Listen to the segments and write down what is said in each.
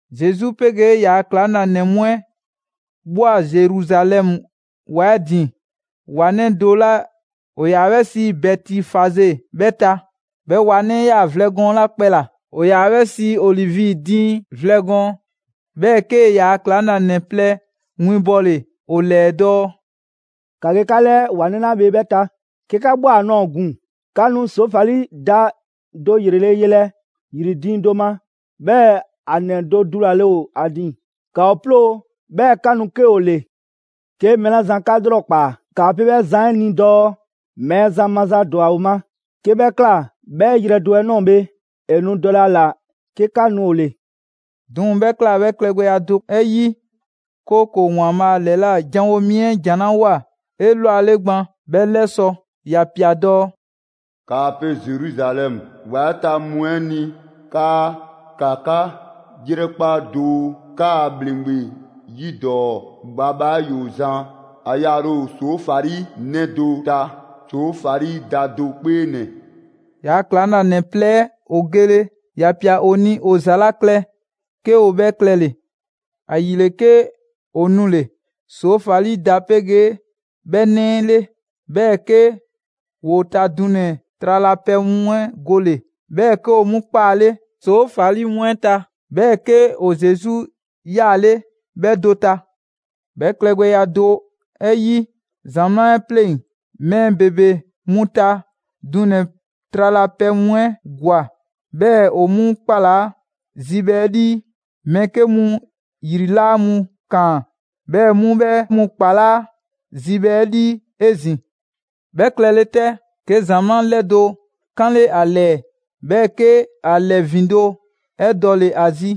Zesu 'pegee ‑yaa' ‑klaŋlanɛ mu 'ɛ ꞊bhwa Zeruzalɛmu ‑wa 'ɛ ‑din ‑wa 'nɛ do 'la ‑o ‑yaa 'bhɛ sii Bɛtifaze 'bhɛ ta. 'Bhɛ ‑wa 'nɛ 'ɛ 'yaa‑ vlɛ gɔɔn 'la kpɛ ‑la ‑o ‑yaa 'bhɛ sii ‹Olivi diiŋ vlɛ gɔɔn›. 'Bhɛɛ‑ 'kee‑ ‑yaa' ‑klaŋlanɛ plɛ winbɔle ‑o ‑lɛɛ dɔɔ: «‑Ka ge 'ka 'lɛɛ ‑wa 'nɛ 'la bhe 'bhɛ ta; 'ke 'ka ꞊bhwa ‑a ꞊nɔɔ ‑gun, 'ka nu ‑soofali da do ‑yrele' yelɛ ‑yri diiŋ do ma; 'bhɛɛ‑ ‑a ‑nɛ do dulale ‑o ‑a ‑din. ‑Ka ‑o 'ploo‑, 'bhɛɛ‑ 'ka nu 'ke ‑o ‑le. 'Ke mɛɛ 'la zan 'ka 'lrɔkpaa‑, 'kaa pe 'bhɛ zan 'ɛ ni dɔɔ: ‹Mɛɛzan maza ‑dwa ‑o ma.› 'Ke 'bhɛ ꞊kla, 'bhɛ yrɛ do 'ɛ ꞊nɔɔ bhe, ‑e nu dɔlɛ ‑a ‑la 'ke 'ka nu ‑o ‑le.» 'Duŋ‑ 'bhɛ ꞊kla 'bhɛɛ‑ klɛgbɛya do 'ɛ 'yi, 'kooko‑ ‑Waanbhaa' ‑lɛla' janwo mi 'ɛ ‑jan 'la ꞊woa 'elwale gban 'bhɛ 'lɛsɔ‑; ‑ya ꞊pia dɔɔ: «‑Kaa pe Zeruzalɛmu ‑wa 'ɛ ta mu 'ɛ ni 'kaa: ‑Ka 'ka ‑yrɛkpa' doo, 'kaa ‑bhleŋgbe 'yidɔɔ‑ bhabha 'ɛ ‑yoo zan, ‑a yaale ‑o ‑soofali 'nɛ do ta, ‑soofali da do 'kpee ‑nɛ.» ‑Yaa' ‑klaŋlanɛ plɛ 'ɛ ‑o gele, ‑ya ꞊pia ‑o ni ‑o ‑za 'la klɛ 'ke ‑o 'bhɛ klɛle‑. ‑Ayile, 'ke ‑o nule‑ ‑soofali da 'pegee 'bhɛ 'nɛ 'ɛ 'le. 'Bhɛɛ‑ 'ke ‑woo ta dunɛ‑ tralapɛ mu 'ɛ gole‑, 'bhɛɛ‑ 'ke ‑o 'mu 'kpaale ‑soofali mu 'ɛ ta. 'Bhɛɛ‑ 'ke ‑o Zesu 'yaale 'bhɛ do ta. 'Bhɛ klɛgbɛya do 'ɛ 'yi, ‑zamaa' 'ɛ 'pleŋ‑ mɛɛ ‑bebe 'mu ta dunɛ‑ tralapɛ mu 'ɛ ‑gwa, 'bhɛɛ‑ ‑o 'mu ‑kpalaa' zibhɛ 'ɛ 'lii; mɛɛ 'ke mu ‑yri ‑laa mu ‑kaan, 'bhɛɛ‑ 'mu 'bhɛ mu ‑kpalaa' zibhɛ 'ɛ 'lii 'ezin‑. 'Bhɛ klɛle 'tɛ, 'ke ‑zamaa' 'ɛ 'lɛdo‑ 'kanle ‑a ‑lɛɛ, 'bhɛɛ‑ 'ke ‑a ‑lɛ ‑vindo' 'ɛ dɔle‑ ‑a zi,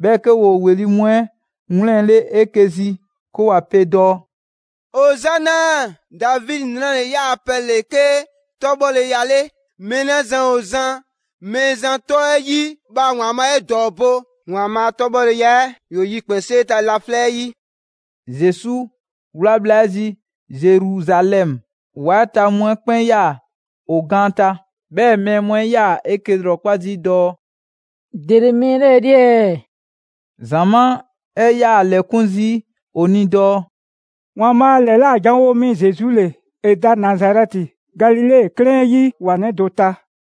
'bhɛɛ‑ 'ke ‑woo ‑weli' mu 'ɛ 'wlɛnle‑ 'eke‑ zi 'ke ‑wa pe dɔɔ: «Ozana! Davidi 'nranɛ‑ 'ɛ ‑yaa' pɛ ‑le 'ke 'tɔbhɔleya 'le! Mɛɛ 'la zan ‑o zan Mɛɛzan 'tɔ 'ɛ 'yi, bhaa ‑Waanbhaa' 'e ‑dɔɔbo'! ‑Waanbhaa' a 'tɔbhɔleya 'ɛ ‑yoo yikpɛnsee ta laflɛ' 'yi!» Zesu 'wla bhla 'ɛ zi Zeruzalɛmu, ‑wa 'ɛ ta mu 'ɛ 'kpɛn 'yaa‑ ‑o gaan ta. 'Bhɛɛ‑ mɛɛ mu 'ɛ 'yaa‑ 'eke‑ ‑lrɔkpa' zii' dɔɔ: «‑Dele mɛɛ 'lɛɛ‑ 'le ɛɛ?» ‑Zamaa' 'ɛ 'yaa‑ 'lɛkun zii' ‑o ni dɔɔ: «‑Waanbhaa' ‑lɛla' janwo mi Zesu ‑le. ‑E da Nazarɛti, Galile 'klɛɛn 'ɛ 'yi ‑wa 'nɛ do ta.»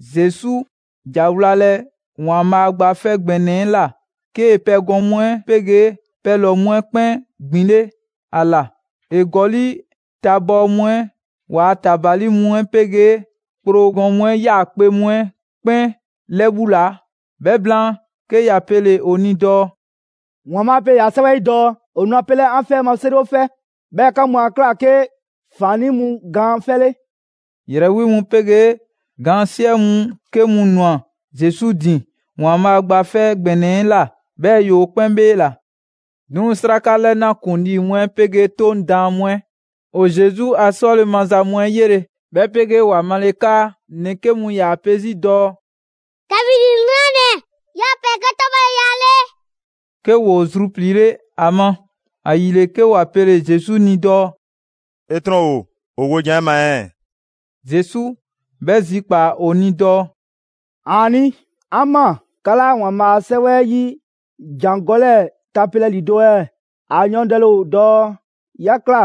Zesu ‑ja wlalɛ ‑Waanbhaa' Gba 'Fɛ ‑Gbɛnɛ 'ɛ ꞊la, 'kee‑ pɛgɔn mu 'ɛ 'pegee pɛlɔ‑ mu 'ɛ 'kpɛn ‑gbinle' ‑a ‑la. ‑E ‑gɔli' tabɔɔ mu 'ɛ ‑waa' ‑tabali mu 'pegee kpro gɔn mu 'ɛ 'yaakpe‑ mu 'ɛ 'kpɛn 'lɛbhulaa. 'Bhɛ blaan, 'ke ‑ya pele‑ ‑o ni dɔɔ: «‑Waanbhaa' pe ‑yaa' 'Sɛwɛ 'ɛ 'yi dɔɔ: ‹‑O nu 'a pelɛ 'an 'fɛ 'ɛ ma 'seriwofɛ.› 'Bhɛɛ‑ 'ka mu 'a ꞊kla 'ke ‑faannii' mu gaan 'fɛ 'le.» ‑Yrɛ 'wi mu 'pegee gaan 'siɛ mu 'ke mu ꞊nwa Zesu ‑din ‑Waanbhaa' Gba 'Fɛ ‑Gbɛnɛ 'ɛ ꞊la, 'bhɛɛ‑ ‑yoo 'kpɛn 'bheela‑. 'Duŋ‑ 'sraka 'lɛna ‑kuŋlii mu 'ɛ 'pegee 'Toŋ daan mu 'ɛ ‑o Zesu a 'sɔle‑ maza mu 'ɛ 'yele‑, 'bhɛ 'pegee ‑wa male 'kaa ‑nɛ 'ke mu ‑yaa pe 'zi dɔɔ: «Davidi 'nranɛ‑ ‑yaa' pɛ ‑le 'ke 'tɔbhɔleya 'ɛ 'le», 'ke ‑woo zrupliile 'a ma. ‑Ayile, 'ke ‑wa pele‑ Zesu ni dɔɔ: «'E 'trɔn ‑o ‑o wojan 'ɛ ma ɛɛ?» Zesu 'bhɛ zikpaa‑ ‑o ni dɔɔ: «‑Aani'! 'An ꞊maa. 'Ka 'laa ‑Waanbhaa' a 'Sɛwɛ 'ɛ 'yi ‑jangɔ' 'lɛɛ tapelɛ ‑lido' ɛɛ? ‑A yɔɔndɛle ‑o dɔɔ: ‹'Ya ꞊kla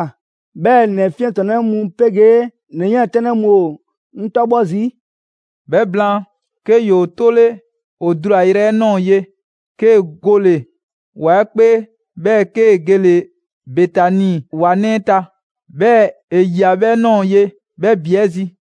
'bhɛɛ‑ ‑nɛ 'fiɛntrɔnnɛ mu 'pegee ‑nɛ 'yiɛntɛnnɛ mu ‑o 'ŋ 'tɔbhɔ zii'.›» 'Bhɛ blaan, 'ke ‑yoo 'tole ‑o dulayrɛ 'ɛ ꞊nɔɔ ye, 'kee‑ gole ‑wa 'ɛ 'kpee, 'bhɛɛ‑ 'kee‑ gele‑ Betani ‑wa 'nɛ 'ɛ ta. 'Bhɛɛ‑ ‑e ꞊yia 'bhɛɛ‑ ꞊nɔɔ ye 'bhɛ ‑bi 'ɛ zi.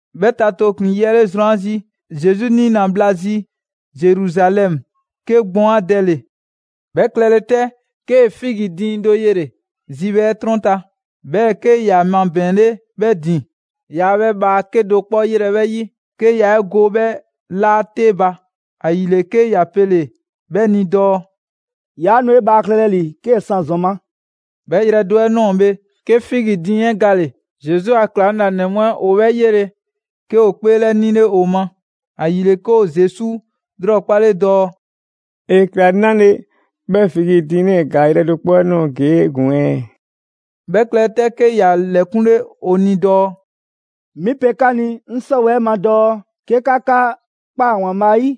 'Bhɛ ta tooklin‑ yi 'le zrwan 'ɛ zi, Zesu 'niina‑ bhla zi Zeruzalɛmu, 'ke gbɔn 'a dɛle‑. 'Bhɛ klɛle 'tɛ, 'kee‑ figi diiŋ do yele‑ zibhɛ 'ɛ 'trɔn ta, 'bhɛɛ‑ 'ke ‑ya mabɛɛnle 'bhɛ ‑din. Yaa 'bhɛ bhaa 'kedo‑ 'kpɔ 'yelɛ‑ 'bhɛ 'yi, 'ke yaa 'e go 'bhɛ 'laa 'te ba. ‑Ayile, 'ke ‑ya pele‑ 'bhɛ ni dɔɔ: «'Yaa nu 'e bhaa klɛlɛ ‑li 'kee‑ 'san ‑zɔn ma!» 'Bhɛ yrɛ do 'ɛ ꞊nɔɔ bhe, 'ke figi diiŋ 'ɛ gale‑. Zesu a ‑klaŋlanɛ mu 'ɛ ‑o 'bhɛ 'yele‑, 'ke ‑o 'kpeelɛnile ‑o ma. ‑Ayile, 'ke ‑o Zesu 'lrɔkpale dɔɔ: «‑E ꞊kla 'nale‑ 'bhɛɛ‑ figi diiŋ 'lɛɛ‑ ‑gaa yrɛ do 'kpɔ 'ɛ ꞊nɔɔ ‑gun ɛɛ?» 'Bhɛ klɛle 'tɛ, 'ke ‑ya 'lɛkunle ‑o ni dɔɔ: «'Mi pe 'ka ni 'ŋ 'sɔwɛɛ‑ 'ɛ ma dɔɔ 'ke 'ka 'ka ꞊kpaa ‑Waanbhaa' 'yi,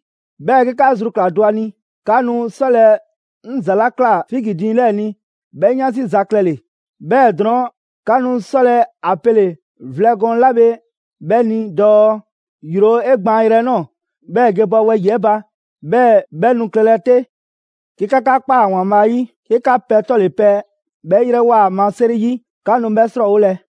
'bhɛɛ‑ 'ke 'ka zru ꞊kla do ‑a ni, 'ka nu 'sɔlɛ‑ 'ŋ ‑za 'la ꞊kla figi diiŋ 'lɛɛ‑ ni 'bhɛ 'yansi za klɛle‑, 'bhɛɛ‑ drɔɔn', 'ka nu 'sɔlɛ‑ a pele‑ vlɛ gɔɔn 'la bhe 'bhɛ ni dɔɔ: ‹‑Yro 'e gbaanyrɛ 'ɛ ꞊nɔɔ, 'bhɛɛ‑ ge bɔ wɛyi‑ 'ɛ ba.› 'Bhɛɛ‑ 'bhɛ nu klɛle‑ 'te. 'Ke 'ka 'ka ꞊kpaa ‑Waanbhaa' 'yi, 'ke 'ka pɛ 'tɔle‑ pɛ 'bhɛ 'yrɛwoa‑ ‑a ma 'seri 'yi, 'ka nu 'bhɛ 'srɔɔwolɛ.»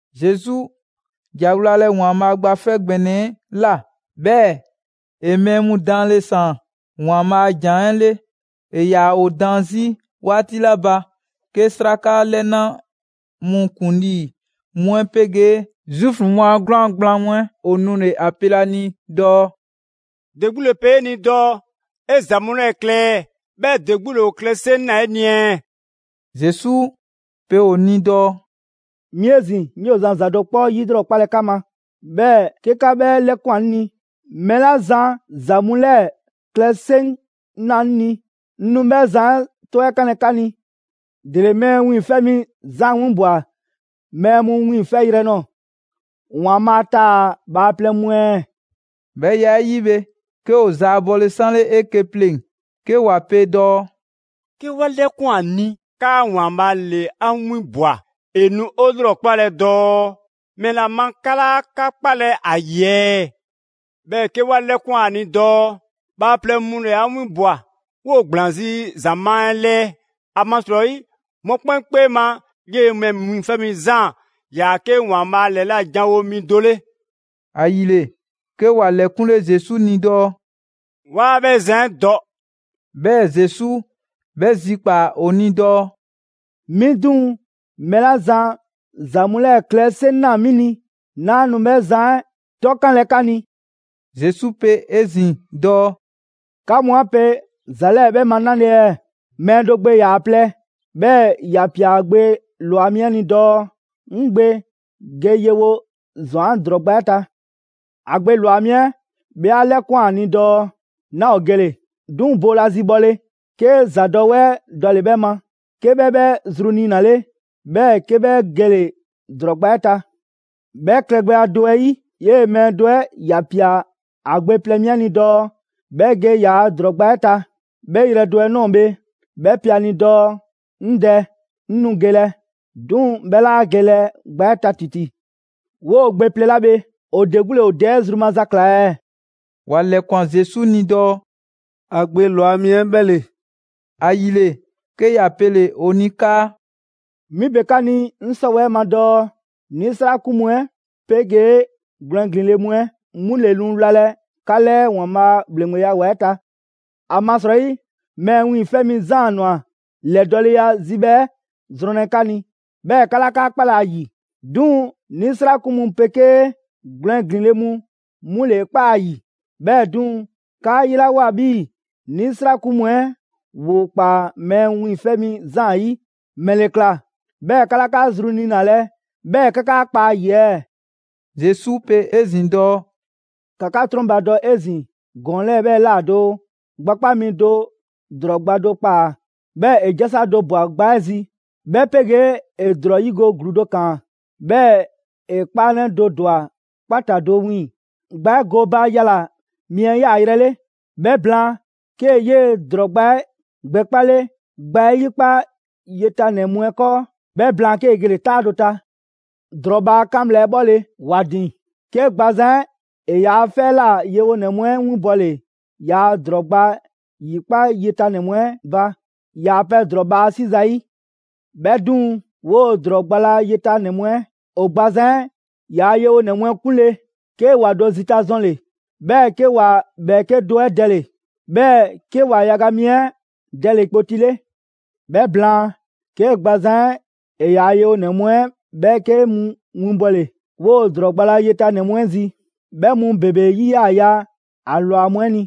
Zesu ‑ja wlalɛ ‑Waanbhaa' Gba 'Fɛ ‑Gbɛnɛ 'ɛ ꞊la, 'bhɛɛ‑ ‑e mɛɛ mu daanle ‑saan ‑Waanbhaa' a ‑jan 'ɛ 'le. ‑E ‑yaa ‑o daan 'zi 'waati 'la ba, 'ke 'sraka 'lɛna mu ‑kuŋlii mu 'ɛ 'pegee Zuufu mu a 'gwlaan‑ gblaan mu 'ɛ ‑o nule‑ ‑a pelɛ ‑a ni dɔɔ: «‑De 'gbu ‑le pe 'e ni dɔɔ 'e ‑za mu 'lɛɛ‑ klɛ ɛɛ? 'Bhɛɛ‑ ‑de 'gbu ‑le ‑o klɛ 'seŋ ꞊naa 'e ni ɛɛ?» Zesu pe ‑o ni dɔɔ: «'Mi 'ezin‑ 'ŋ 'yoo‑ zan ‑za do 'kpɔ 'yilrɔkpalɛ 'ka ma, 'bhɛɛ‑ 'ke 'ka 'bhɛ 'lɛkwan‑ 'ŋ ni, mɛɛ 'la zan ‑za mu 'lɛɛ‑ klɛ 'seŋ ꞊naa 'ŋ ni, 'ŋ nu 'bhɛ zan 'ɛ 'tɔ 'ɛ 'kanlɛ‑ 'ka ni. ‑Dele Mɛɛ Wiiŋfɛ' Mi Zaan 'winbwa‑ mɛɛ mu wiiŋfɛyrɛ nɔɔ‑, ‑Waanbhaa' taa‑ bhaaplɛŋ mu ɛɛ?» 'Bhɛ ya 'ɛ 'yi bhe, 'ke ‑o zaabɔle 'sanle 'eke‑ pleŋ‑ 'ke ‑wa pe dɔɔ: «'Ke 'wa 'lɛkwan‑ ‑a ni 'kaa ‑Waanbhaa' ‑le 'a 'winbwa‑, ‑e nu 'o 'lrɔkpalɛ dɔɔ: ‹‑Mɛla ma 'ka 'laa 'ka 'kpalɛ‑ ‑a ‑yi ɛɛ?› 'Bhɛɛ‑ 'ke 'wa 'lɛkwan‑ ‑a ni dɔɔ: ‹Bhaaplɛŋ mu ‑le 'a 'winbwa‑, 'woo‑ ‑gblaan 'zi ‑zamaa' 'ɛ 'lɛɛ.› ‑Amasrɔyi mɔkpɛn' 'kpee ma 'yee‑ Mɛɛ Wiiŋfɛ' Mi Zaan ‑yaa 'ke ‑Waanbhaa' ‑lɛla' janwo mi do 'le.» ‑Ayile, 'ke ‑wa ‑lɛkunle Zesu ni dɔɔ: «'Waa 'bhɛ zan 'ɛ dɔ.» 'Bhɛɛ‑ Zesu 'bhɛ zikpaa‑ ‑o ni dɔɔ: «'Mi 'duŋ‑, mɛɛ 'la zan ‑za mu 'lɛɛ‑ klɛ 'seŋ ꞊naa 'mi ni, 'naa nu 'bhɛ zan 'ɛ 'tɔkanlɛ 'ka ni.» Zesu pe 'ezin‑ dɔɔ: «'Ka mu 'a pe ‑za 'lɛɛ‑ 'bhɛ ma 'nale‑ ɛɛ?» Mɛɛ do gbe ‑yaa plɛ, 'bhɛɛ‑ ‑ya ‑pia ‑a gbe ‑lwa mi 'ɛ ni dɔɔ: «'Ŋ gbe ge yewo ‑zɔn 'an ‑drɔɔ gba 'ɛ ta. A gbe ‑lwa mi 'ɛ 'bhɛ 'a 'lɛkwan‑ ‑a ni dɔɔ: ‹'Naa ‑o gele‑›. 'Duŋ‑ boolazi bhɔle, 'ke ‑zadɔwɛɛ dɔle 'bhɛ ma, 'ke 'bhɛ 'bhɛ zru niinale, 'bhɛɛ‑ 'ke 'bhɛ gele‑ ‑drɔɔ gba 'ɛ ta. 'Bhɛ klɛgbɛya do 'ɛ 'yi, 'yee‑ mɛɛ do 'ɛ ‑ya ‑pia ‑a gbe plɛ mi 'ɛ ni dɔɔ 'bhɛ ge ‑yaa' ‑drɔɔ gba 'ɛ ta. 'Bhɛ yrɛ do 'ɛ ꞊nɔɔ bhe, 'bhɛ pe ‑a ni dɔɔ: ‹'Ŋ dɛ, 'ŋ nu gelɛ›. 'Duŋ‑ 'bhɛ 'laa gelɛ gba 'ɛ ta ‑titi. 'Woo‑ gbe plɛ 'la bhe ‑o ‑de 'gbu ‑le ‑o dɛ 'ɛ zru maza ꞊kla ɛɛ?» ‑Wa ‑lɛkwan Zesu ni dɔɔ: «‑A gbe ‑lwa mi 'ɛ 'bhɛ ‑le.» ‑Ayile, 'ke ‑ya pele ‑o ni 'kaa: «'Mi pe 'ka ni 'ŋ 'sɔwɛɛ‑ ma dɔɔ 'nisrakun mu 'ɛ 'pegee gwlɛn ‑glin le mu 'ɛ 'mu ‑le nu wlalɛ 'ka 'lɛɛ ‑Waanbhaa' a ‑bhleŋgbeya ‑wa 'ɛ ta. ‑Amasrɔyi Mɛɛ Wiiŋfɛ' Mi Zaan ꞊nwa ‑lɛdɔɔleya zibhɛ 'ɛ zrɔnlɛ 'ka ni, 'bhɛɛ‑ 'ka 'laa 'ka 'kpalɛ‑ ‑a ‑yi; 'duŋ‑ 'nisrakun mu 'pegee gwlɛn ‑glin le mu 'mu ‑le 'e ‑kpaa ‑a ‑yi. 'Bhɛɛ‑ 'duŋ‑, 'kaa 'yelawoa 'bhii‑ 'nisrakun mu 'ɛ ‑woo ‑kpaa Mɛɛ Wiiŋfɛ' Mi Zaan 'yi, ‑mɛle ꞊kla 'bhɛɛ‑ 'ka 'laa 'ka zru niinalɛ 'bhɛɛ‑ 'ka 'ka kpa ‑a ‑yi ɛɛ?» Zesu pe 'ezin‑ dɔɔ: «‑Ka 'ka 'trɔnbadɔ 'ezin‑ ‑gɔɔn 'lɛɛ‑ 'bhɛ ꞊la doo: Gbakpa' mi do ‑drɔɔ gba do ‑kpaa. 'Bhɛɛ‑ ‑e 'jasa do ꞊bwa gba 'ɛ zi, 'bhɛ 'pegee ‑e ‑drɔɔ 'yigo‑ ‑gluu dɔ ‑kaan, 'bhɛɛ‑ ‑e 'kpaanɛ do ‑dwa 'kpata‑ do wiiŋ‑ gba 'ɛ gooba yala‑ mi 'ɛ 'yaayrɛ‑ 'le. 'Bhɛ blaan, 'kee‑ 'yee‑ ‑drɔɔ gba 'ɛ gbɛkpale gba 'ɛ 'yikpa yetanɛ mu 'ɛ 'kɔɔ. 'Bhɛ blaan, 'kee‑ gele‑ 'taa do ta. ‑Drɔɔ bhaa 'kan bhla 'ɛ 'bhɔle‑ 'e ‑din, 'ke gbazan 'ɛ ‑e ‑yaa' 'fɛ 'ɛ ꞊la yewonɛ mu 'ɛ winbɔle ‑yaa' ‑drɔɔ gba ‑yikpa' yetanɛ 'ɛ mu 'ɛ ba, ‑yaa' pɛ ‑drɔɔ bhaa 'si zayi'. 'Bhɛ 'duŋ‑, 'woo‑ ‑drɔɔ gba la yetanɛ mu 'ɛ ‑o gbazan 'ɛ ‑yaa' yewonɛ mu 'ɛ 'kunle, 'ke ‑wa do zita zɔnle‑; 'bhɛɛ‑ 'ke ‑wa ‑bhɛɛke' do 'ɛ dɛle‑, 'bhɛɛ‑ 'ke ‑o ‑wa yaga mi 'ɛ dɛle‑ kpoti 'le. 'Bhɛ blaan, 'ke gbazan 'ɛ ‑e ‑yaa' yewonɛ mu 'ɛ ‑bhɛɛke' mu winbɔle 'woo‑ ‑drɔɔ gba la yetanɛ mu 'ɛ zi. 'Bhɛ mu ‑bebe 'yi 'yaa‑ ya ‑a ‑lwa mu 'ɛ ni.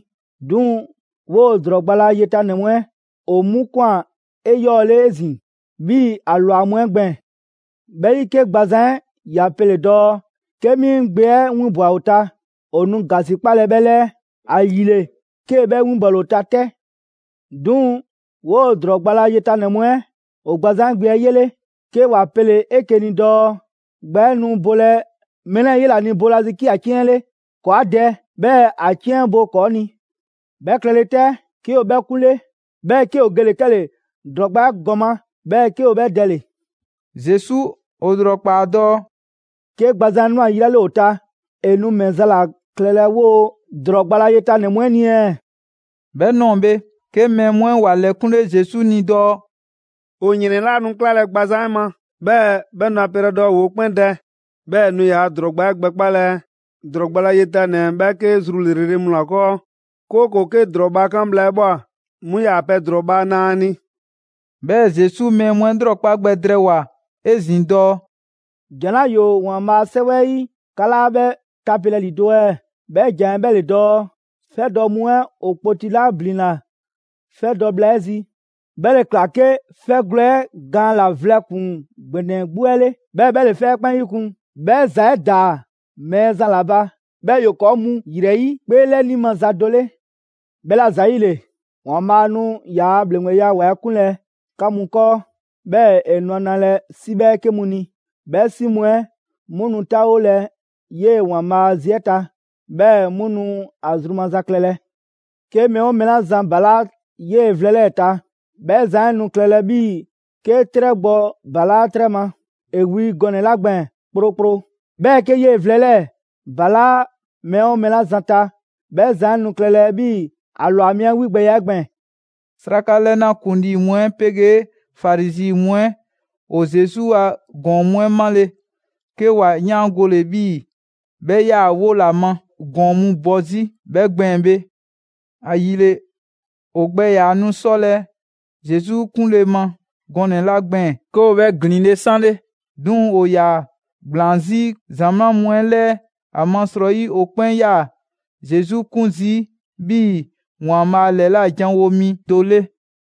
'Duŋ‑ 'woo‑ ‑drɔɔ gba la yetanɛ mu 'ɛ ‑o 'mu ꞊kwan 'eyɔɔle 'ezin‑ 'bhii‑ ‑a ‑lwa mu 'ɛ gbɛɛn‑. 'Bhɛ 'yi, 'ke gbazan 'ɛ ‑ya pele‑ dɔɔ: ‹'Ke 'mi 'ŋ gbe 'ɛ 'winbwa‑ ‑o ta, ‑o nu ‑gasikpalɛ 'bhɛ 'lɛɛ.› ‑Ayile, 'kee‑ 'bhɛ 'winbɔle ‑o ta 'tɛ. 'Duŋ‑, 'woo‑ ‑drɔɔ gba la yetanɛ mu 'ɛ ‑o gbazan 'ɛ gbe 'ɛ 'yele‑, 'ke ‑wa pele‑ 'eke‑ ni dɔɔ: ‹Gba 'ɛ nu bolɛ mɛɛ 'lɛɛ‑ 'yela‑ ni boolazi 'ke ‑a 'ciɛn 'le. ‑Kɔɔ' 'a dɛ, 'bhɛɛ‑ ‑a 'ciɛn 'ɛ bo ‑kɔɔ' ni!› 'Bhɛ klɛle 'tɛ, 'ke ‑o 'bhɛ 'kunle, 'bhɛɛ‑ 'ke ‑o gele‑ 'kɛle‑ ‑drɔɔ gba 'ɛ ‑gɔma', 'bhɛɛ‑ 'ke ‑o 'bhɛ dɛle‑.» Zesu ‑o ‑lrɔkpaa dɔɔ: «'Ke gbazan 'ɛ ꞊nwa yi 'la 'le ‑o ta, ‑e nu ‑mɛ za ‑la klɛlɛ 'woo‑ ‑drɔɔ gba la yetanɛ mu 'ɛ ni ɛɛ?» 'Bhɛ ꞊nɔɔ bhe 'ke mɛɛ mu 'ɛ ‑wa ‑lɛkunle Zesu ni dɔɔ: «‑O ‑yrɛn 'laa nu 'klalɛ‑ gbazan 'ɛ ma, 'bhɛɛ‑ 'bhɛ nu ‑a pelɛ dɔɔ ‑woo 'kpɛn dɛ; 'bhɛɛ‑ ‑e nu ‑yaa' ‑drɔɔ gba 'ɛ gbɛkpalɛ ‑drɔɔ gba la yetanɛ ‑bhɛɛke' zru ‑lrele' mu ‑la 'kɔɔ; 'kooko‑ 'ke ‑drɔɔ bhaa 'kan bhla 'ɛ ꞊bhwa, 'mu ‑yaa pɛ drɔɔ bhaa na ‑a ni.» 'Bhɛɛ‑ Zesu mɛɛ mu 'ɛ 'lrɔkpa gbɛ drɛɛwoa‑ 'ezin‑ dɔɔ: «‑Jan 'la ‑yoo ‑Waanbhaa' a 'Sɛwɛ 'ɛ 'yi 'ka 'laa 'bhɛ tapelɛ ‑lido' ɛɛ? 'Bhɛ ‑jan 'ɛ 'bhɛ ‑le dɔɔ: ‹'Fɛ dɔ mu 'ɛ ‑o kpoti 'la ‑blinna 'fɛ dɔ bhla 'ɛ 'zi, 'bhɛ ‑le ꞊kla 'ke 'fɛgwlɛ‑ 'ɛ gaan ‑la vlɛ ‑kpuŋ ‑gbɛnɛ 'gbu 'ɛ 'le, 'bhɛɛ‑ 'bhɛ ‑le 'fɛ 'ɛ 'kpɛn 'yikun‑. 'Bhɛ ‑za 'ɛ ‑daa Mɛɛzan ‑la ba, 'bhɛɛ‑ ‑yoo ‑kɔɔ' mu ‑yrɛ 'yi 'kpeelɛni maza do 'le.› «'Bhɛla‑ ‑zayile, ‑Waanbhaa' nu ‑yaa' ‑bhleŋgbeya ‑wa 'ɛ 'kunlɛ‑ 'ka mu 'kɔɔ, 'bhɛɛ‑ ‑e nu ‑a nalɛ 'si 'bhɛɛke mu ni. 'Bhɛ 'si mu 'ɛ 'mu nu taawolɛ 'yee‑ ‑Waanbhaa' a zi 'ɛ ta, 'bhɛɛ‑ 'mu nu ‑a zru maza klɛlɛ. ['Ke mɛɛ 'oo mɛɛ 'la zan ‑balaa' 'yee‑ vlɛ 'lɛɛ‑ ta, 'bhɛ zan 'ɛ nu klɛlɛ 'bhii‑ 'ke 'trɛ gbɔ ‑balaa' 'trɛ ma, ‑e wi gɔnɛ‑ 'la gbɛɛn‑ 'krokro; 'bhɛɛ‑ 'ke 'yee‑ vlɛ 'ɛ 'lɛɛ‑ ‑balaa' mɛɛ 'oo mɛɛ 'la zan ta, 'bhɛ zan 'ɛ nu klɛlɛ 'bhii‑ ‑a ‑lwa mi 'ɛ 'wigbɛya 'ɛ gbɛɛn‑.»] 'Sraka 'lɛna ‑kuŋlii mu 'ɛ 'pegee Farizi mu 'ɛ ‑o Zesu ‑a ‑gɔɔn mu 'ɛ 'male‑, 'ke ‑wa 'yaangole 'bhii‑ 'bhɛ 'yaa‑ 'wo ‑la ma ‑gɔɔn mu bɔ 'zi 'bhɛ gbɛɛn‑ bhe. ‑Ayile, ‑o gbɛ ‑yaa nu 'sɔlɛ‑ Zesu 'kunle ma gɔnɛ‑ 'la gbɛɛn‑, 'ke ‑o 'bhɛ ‑glinle' 'sanle. 'Duŋ‑ ‑o ‑yaa ‑gblaan 'zi ‑zamaa' mu 'ɛ 'lɛɛ, ‑amasrɔyi ‑o 'kpɛn 'yaa‑ Zesu 'kun zii' 'bhii‑ ‑Waanbhaa' ‑lɛla' janwo mi do 'le.